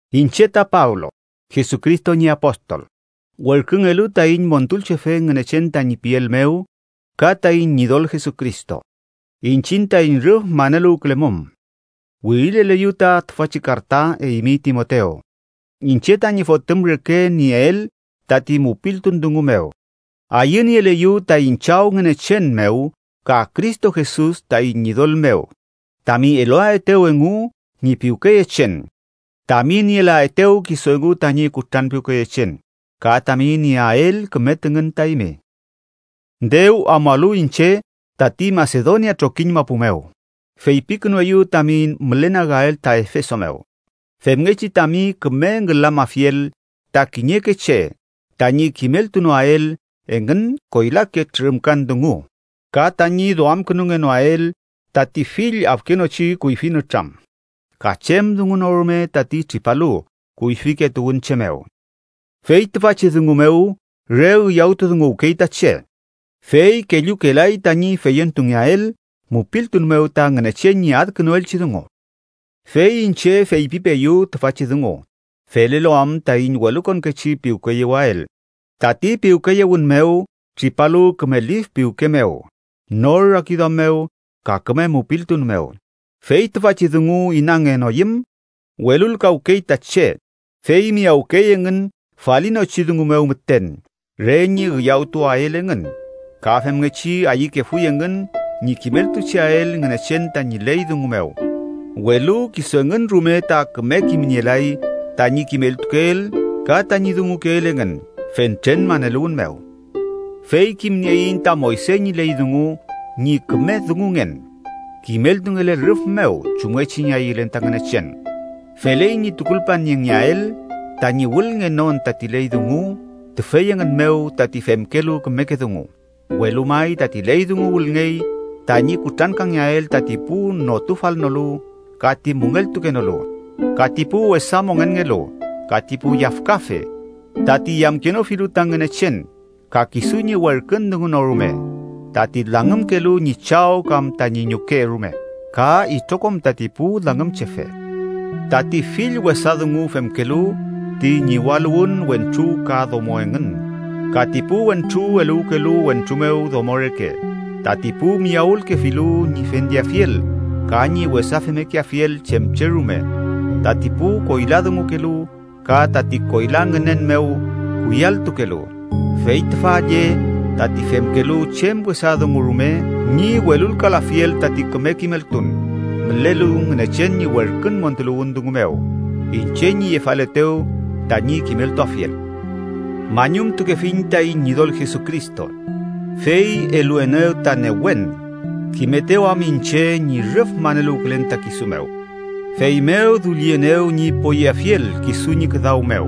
Iñche ta Pablo, Jesucristo ñi apostol, werküngelu taiñ Montulchefe Ngünechen tañi piel mew ka taiñ Ñidol Jesucristo, iñchiñ taiñ rüf maneluwkülemum, wirileleyu ta tüfachi karta, eymi Timotew, iñche tañi fotüm reke nieel tati mupiltun dungu mew. Ayünieleyu taiñ Chaw Ngünechen mew ka Cristo Jesus taiñ Ñidol mew tami eluaetew engu ñi piwkeyechen, tami nielaetew kisu engu tañi kutranpiwkeyechen, ka tami nieael küme tüngün ta eymi. Dew amualu iñche tati Masedonia trokiñ mapu mew, feypikünueyu tami mülenagael ta Efeso mew, femngechi tami küme ngülamafiel ta kiñeke che tañi kimeltunoael engün koylake trürümkan dungu ka tañi duamkünungenoael tati fill afkenochi kuyfi nütram ka chem dungu no rume tati tripalu kuyfike tuwünche mew. Fey tüfachi dungu mew am re üyawtudunguwkey ta che, fey kellukelay tañi feyentungeael mupiltun mew ta Ngünechen ñi adkünuelchi dungu. Fey iñche feypipeeyu tüfachi dungu felelu am taiñ welukonkechi piwkeyewael, tati piwkeyewün mew tripalu küme lif piwke mew, nor rakiduam mew, ka küme mupiltun mew. Fey tüfachi dungu inangenoyüm, welulkawkey ta che, fey miyawkey engün falinochi dungu mew müten, re ñi üyawtuwael engün. Ka femngechi ayükefuy engün ñi kimeltucheael Ngünechen tañi ley dungu mew, welu kisu engün rume ta küme kimnielay tañi kimeltukeel ka tañi dungukeel engün fentren maneluwün mew. Fey kimnieiñ ta Moyse ñi ley dungu ñi küme dungungen, kimeltungele rüf mew chumngechi ñi ayülen ta Ngünechen. Feley ñi tukulpaniengeael tañi wülngenon tati ley dungu tüfey engün mew tati femkelu kümeke dungu, welu may tati ley dungu wülngey tañi kutrankangeael tati pu notufalnolu ka ti müngeltukenolu, ka ti pu wesa mongenngelu, ka ti pu yafkafe, tati yamkenofilu ta Ngünechen ka kisu ñi werkün dungu no rume, tati langümkelu ñi chaw kam tañi ñuke rume, ka itrokom tati pu langümchefe, tati fill wesa dungu femkelu ti ñiwaluwün wentru ka domo engün, ka ti pu wentru eluwkelu wentru mew domo reke, tati pu miyawülkefilu ñi fendeafiel ka ñi wesa femmekeafiel chem che rume, tati pu koyladungukelu ka tati koyla ngünen mew kuyalltukelu. Fey tüfa lle tati femkelu chem wesa dungu rume ñi welulkalafiel tati küme kimeltun mülelu Ngünechen ñi werkün montuluwün dungu mew, iñche ñi yefaletew tañi kimeltuafiel. Mañumtukefiñ taiñ Ñidol Jesucristo, fey eluenew ta newen, kimetew am iñche ñi rüf maneluwkülen ta kisu mew, feymew dullienew ñi poyeafiel kisu ñi küdaw mew,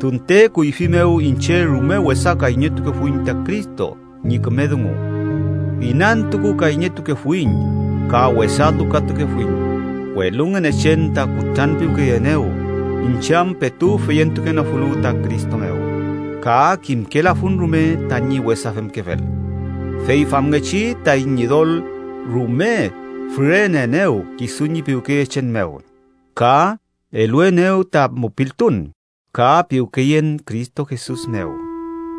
tunte kuyfi mew iñche rume wesa kayñetukefuiñ ta Cristo ñi küme dungu, inantukukayñetukefuiñ ka wesa lukatukefuiñ. Welu Ngünechen ta kutranpiwkeyeenew, iñche am petu feyentukenofulu ta Cristo mew ka kimkelafun rume tañi wesa femkefel. Fey famngechi taiñ Ñidol rume füreneenew kisu ñi piwkeyechen mew, ka eluenew ta mupiltun ka piwkeyen Cristo Jesus mew.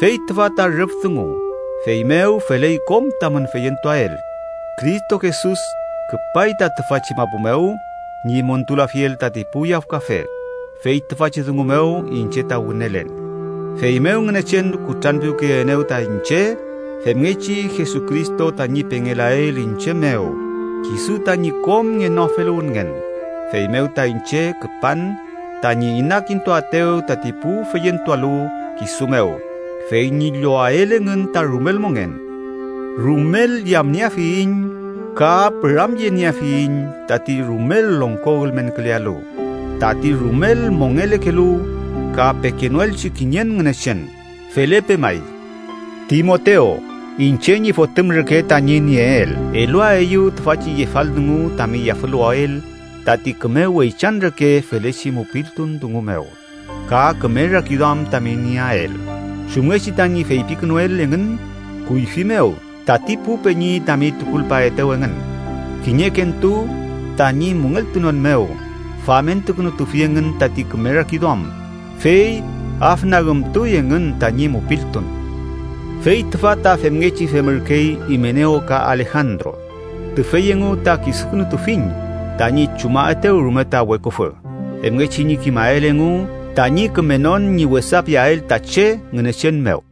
Fey tüfa ta rüf dungu, feymew feley kom tamün feyentuael: Cristo Jesus küpay ta tüfachi mapu mew ñi montulafiel tati pu yafkafe, fey tüfachi dungu mew iñche ta wünelen. Feymew Ngünechen kutranpiwkeyeenew ta iñche femngechi Jesucristo tañi pengelael iñche mew kisu tañi kom ngenoafeluwünngen. Feymew ta iñche küpan tañi inakintuaetew tati pu feyentualu kisu mew fey ñi llowael engün ta rumel mongen. ¡Rumel yamnieafiyiñ ka püramyenieafiyiñ tati rumel longko ülmenkülealu, tati rumel mongelekelu, ka pekenoelchi kiñen Ngünechen! Felepe may. Timotew, iñche ñi fotüm reke tañi nieel, eluaeyu tüfachi yefal dungu tami yafüluwael tati küme weychan reke felechi mupiltun dungu mew ka küme rakiduam tami nieael, chumngechi tañi feypikünuel engün kuyfi mew tati pu peñi tami tukulpaetew engün. Kiñekentu, tañi müngeltunon mew famentukünutufi engün tati küme rakiduam, fey afnagümtuy engün tañi mupiltun. Fey tüfa ta femngechi femürkey Imenew ka Alejandro, tüfey engu ta kisukünutufiñ tañi chumaetew rume ta weküfü femngechi ñi kimael engu tañi kümenon ñi wesa piael ta che Ngünechen mew.